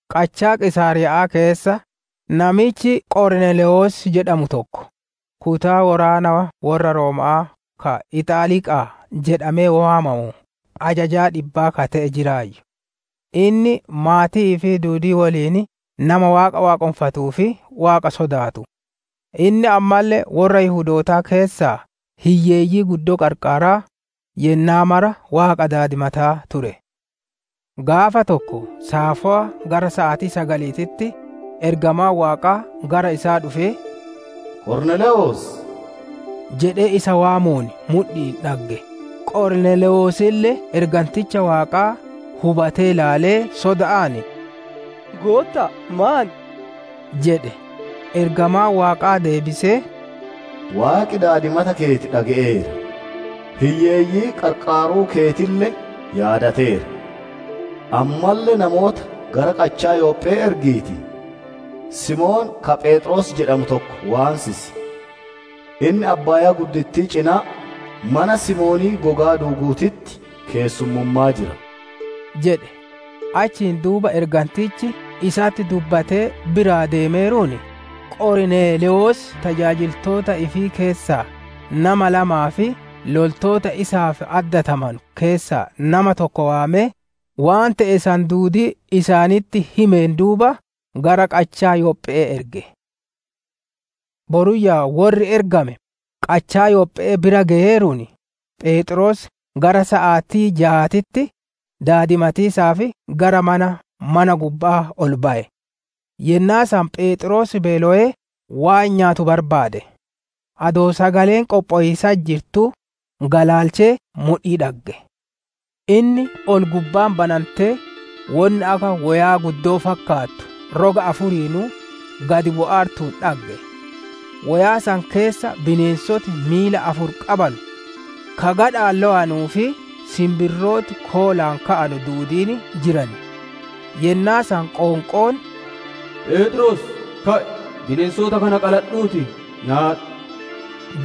Qachaa Qiisaariya'aa keessa namichi Qorneelewos jedhamu tokko, kutaa woraana worra Rooma'aa ka «Ixaaliqaa» jedhamee waamamuuf ajaja dhibbaa ka ite'e jiraayyu. Inni maatii ifii duudii woliin nama Waaqa waaqonfatuu fi Waaqa sodaatu. Inni ammalle worra Yihudootaa keessaa hiyyeeyyii guddoo qarqaaraa, yennaa mara Waaqa daadimataa ture. Gaafa tokko saafowa gara saatii sagaliititti, ergamaan Waaqaa gara isaa dhufee, «Qorneelewos» jedhee isa waamuun mudhi'iin dhagge. Qorneelewosille erganticha Waaqaa hubatee ilaalee soda'aan, «Gootta'a, maan?» jedhe. Ergamaan Waaqaa deebisee, «Waaqi daadimata keeti dhage'eera; hiyyeeyyii qarqaaruu keetille yaadateera. Ammalle namoota gara qachaa Yophe'ee ergiitii, Simoon ka Pheexroos jedhamu tokko waansisi. Inni abbaayaa cinaa mana Simoonii gogaa duuguutitti keessummummaa jira» jedhe. Achiin duuba ergantichi isatti dubbatee biraa deemeeruun, Qorneelewos tajaajiltoota ifii keessaa nama lamaa fi loltoota isaaf addatamanu keessaa nama tokko waamee, waan te'e san duudii isaanitti himeen duuba, gara qachaa Yophe'ee erge. Boruyyaa worri ergame qachaa Yophe'ee bira geyeeruun, Pheexroos gara saatii jaatitti daadimatiisaaf gara mana mana gubba'aa ol baye. Yennaa san Pheexroos beelowee waan nyaatu barbaade; adoo sagaleen qophowiisatti jirtuu galaalchee mudhii dhagge. Inni ol gubbaan banantee, wonni akka woyaa guddoo fakkaattu roga afuriinuu gad bu'aartuun dhagge. Woyaa san keessa bineensoti miila afur qabanu, ka gadha'aan lowanuu fi sinbirrooti koolaan ka'anu duudiin jiran. Yennaa san qoonqoon, «Pheexroos, ka'i; bineensota kana qaladhuutii nyaadhu!»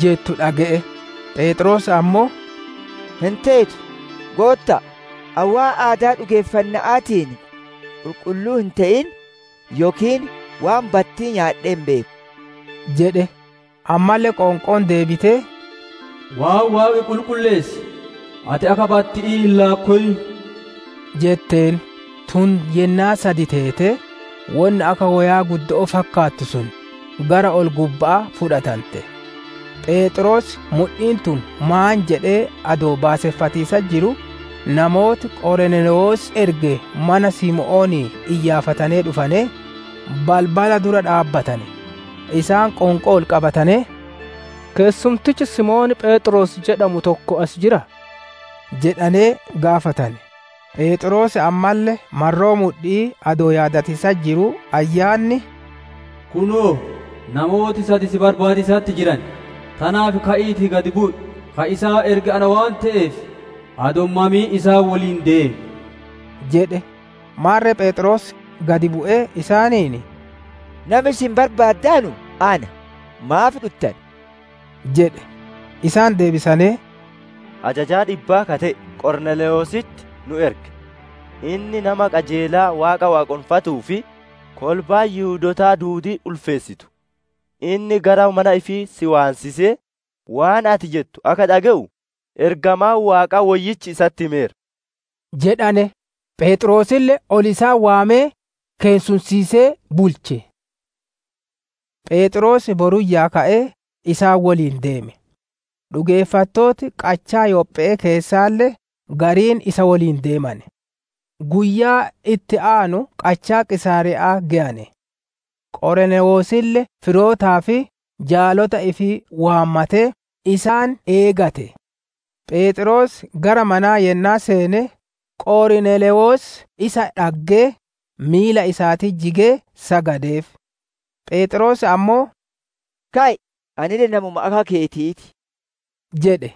jettu dhage'e. Pheexroos ammoo, «Hin teetu, Gootta'a! Ani waan aadaa dhugeeffanna'aatiin qulqulluu hin te'in yookiin waan battii nyaadhee hin beeku» jedhe. Ammalle qoonqoon deebitee, «Waan Waaqi qulqulleesse, ati akka batti'ii hin laakkowin» jetteen. Tun yennaa sad teetee, wonni akka woyaa guddoo fakkaattu sun gara ol-gubba'aa fudhatante. Pheexroos mudhiin tun maan jedhee adoo baaseffatiisatti jiruu, namooti Qorneelewos erge mana Simoonii iyyaafatanee dhufanee, balbala dura dhaabbatane. Isaan qoonqoo ol qabatanee, «Keessumtichi Simoon Pheexroos jedhamu tokko as jiraa?» jedhanee gaafatane. Pheexroos ammalle marroo mudhi'ii adoo yaadatiisatti jiruu Ayyaanni, «Kunoo! Namooti sad si barbaadiisatti jiran. Tanaaf ka'iitii gad bu'i; ka isaan erge ana waan te'eef adoo hin mamin isaan woliin deem» jedhe. Maarre Pheexroos gad bu'ee isaaniin, «Nami isin barbaaddanu ana; maaf dhuttane?» jedhe. Isaan deebisanee, «Ajajaa dhibbaa ka te'e, Qorneelewositti nu erge; inni nama qajeelaa Waaqa waaqonfatuu fi kolbaan Yihudootaa duudiin ulfeessitu; inni gara mana ifii si waansisee, waan ati jettu akka dhage'u, ergamaan Waaqaa woyyichi isatti himeera» jedhane. Pheexroosille ol isaan waamee, keessumsiisee bulche. Pheexroos boruyyaa ka'ee isaan woliin deeme; dhugeeffattooti qachaa Yophee keessaalle gariin isa woliin deemane. Guyyaa itti aanu qachaa Qiisaariya'aa geyane; Qorneelewosille firootaa fi jaalota ifii waammatee, isaan eegate. Pheexroos gara manaa yennaa seene, Qorneelewos isaa dhaggee, miila isaatitti jigee sagadeef. Pheexroos ammoo, «Ka'i! Anille namuma akka keetii ti» jedhe.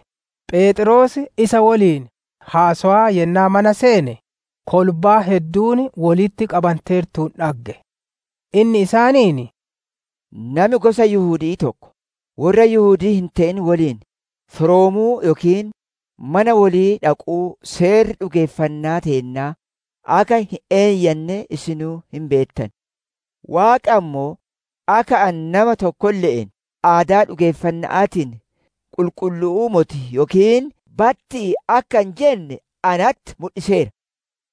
Pheexroos isa woliin haasowaa yennaa mana seene, kolbaan hedduun wolitti qabanteertuun dhagge. Inni isaaniin, «Nami gosa Yihudi'ii tokko, worra Yihudii hin te'in woliin firoomuu yookiin mana wolii dhaquu seerri dhugeeffannaa teennaa akka hin eeyyanne isinuu hin beettan. Waaqi ammoo, akka ani nama tokkolle'een aadaa dhugeeffanna'aatiin qulqullu'uu moti yookiin battii akka hin jenne natti mudhiseera.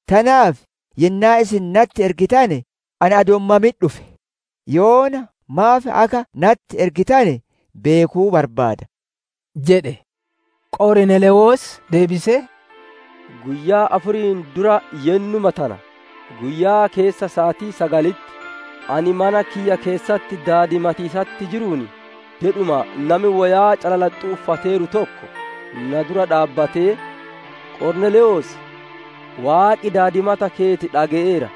Tanaaf yennaa isin natti ergitane, ani adoo hin mamin dhufe; yoona maaf akka natti ergitane beekuu barbaada» jedhe. Qorneelewos deebisee, «Guyyaa afuriin dura yennuma tana guyyaa keessa saatii sagalitti, ani mana kiyya keessatti daadimatiisatti jiruun, dedhuma nami woyaa calalaxxuu uffateeru tokko na dura dhaabbattee, ‹Qorneelewos! Waaqi daadimata keeti dhage'eera;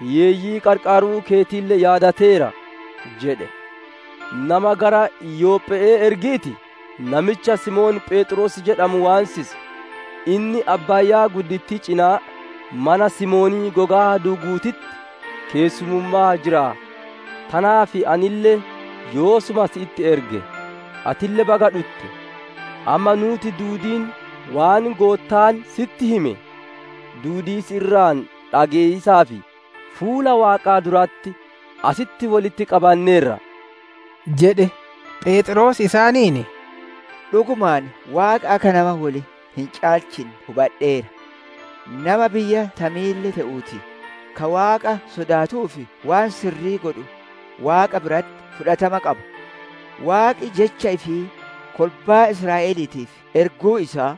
hiyyeeyyii qarqaaruu keetille yaadateera› jedhe. Nama gara Yophe'ee ergiitii namicha Simoon Pheexroos jedhamu waansisi. Inni abbaayaa cinaa mana Simoonii gogaa duuguutitti keessummummaa jira. Tanaaf anille yoosuma sitti erge; atille baga dhutte. Amma nuuti duudiin waan Goottaan sitti hime duudii si irraa dhage'iisaaf, fuula Waaqaa duratti asitti wolitti qabanneerra» jedhe. Pheexroos isaaniin, «Dhugumaan Waaqi akka nama wol hin caalchinne hubadheera. Nama biyya tamiille te'uutii, ka Waaqa sodaatuu fi waan sirrii godhu Waaqa biratti fudhatama qaba. Waaqi Jecha ifii kolbaa Israa'eliitiif erguu isaa,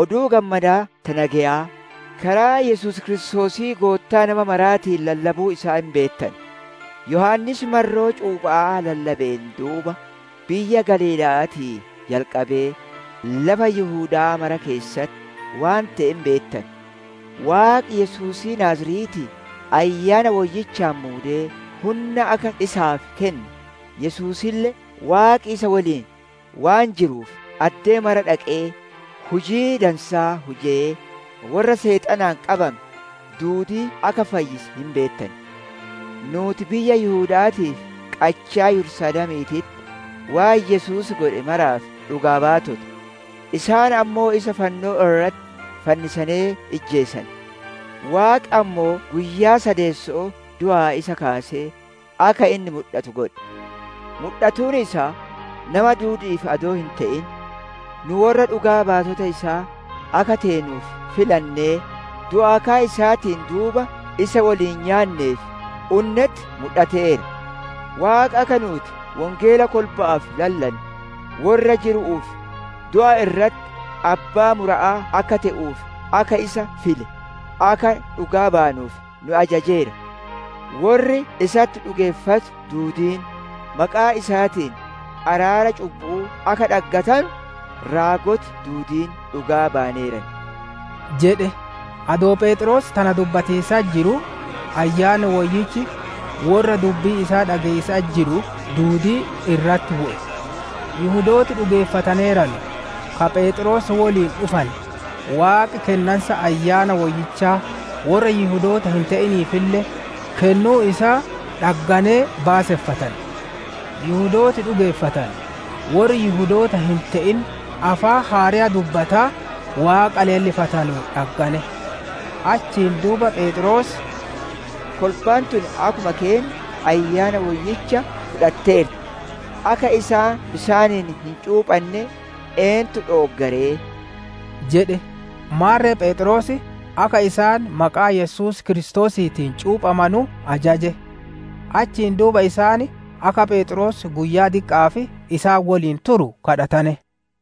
Oduu Gammadaa ta nageyaa, karaa Yesuus Kiristoosii Goottaa nama maraatiin lallabuu isaa hin beettan. Yohaannis marroo cuupha'aa lallabeen duuba, biyya Galiila'aatii jalqabee lafa Yihuda'aa mara keessatti waan te'e hin beettan. Waaqi, Yesuusii Naaziretii Ayyaana Woyyichaan muudee hunna akka isaaf kenne, Yesuusille Waaqi isa woliin waan jiruuf addee mara dhaqee hujii dansaa hujee, worra Seexanaan qabame duudii akka fayyise hin beettan. Nuuti biyya Yihuda'aatii fi qachaa Yerusaalemiititti, waan Yesuus godhe maraaf dhugaa baatota; isaan ammoo isa fannoo irratti fannisanee ijjeesane. Waaqi ammoo guyyaa sadeesso'oo du'aa isa kaasee, akka inni mudhatu godhe. Mudhatuun isaa nama duudi'iif adoo hin te'in, nu worra dhugaa bayoota isaa akka teenuuf filannee, du'aa ka'a isaatiin duuba isa woliin nyaannee fi unnetti mudhateera. Waaqi akka nuuti wongeela kolba'aaf lallannu, worra jiruu fi du'e irratti abbaa mura'aa akka te'uuf akka isa file, akka dhugaa baanuuf nu ajajeera. Worri isatti dhugeeffatu duudiin, maqaa isaatiin araara cubbu'uu akka dhaggatanu, raagoti duudiin dhugaa bayaneeran» jedhe. Adoo Pheexroos tana dubbatiisatti jiruu, Ayyaanni Woyyichi worra dubbii isaa dhage'iisatti jiru duudii irratti bu'e. Yihudooti dhugeeffataneeranu ka Pheexroos woliin dhufane, Waaqi kennansa Ayyaana Woyyichaa worra Yihudoota hin te'iniifille kennuu isaa dhagganee baaseffatane. Yihudooti dhugeeffatane, worri Yihudoota hin te'in afaan haareya dubbataa Waaqa leellifatanuun dhaggane. Achiin duuba Pheexroos, «Kolbaan tun akkuma keenna Ayyaana Woyyicha fudhatteerti. Akka isaan bisaaniin hin cuuphanne eentu dhoogga ree?» jedhe. Maarre Pheexroos akka isaan maqaa Yesuus Kiristoosiitiin cuuphamanu ajaje. Achiin duuba isaan akka Pheexroos guyyaa diqqa'aaf isaan woliin turu gaafatane.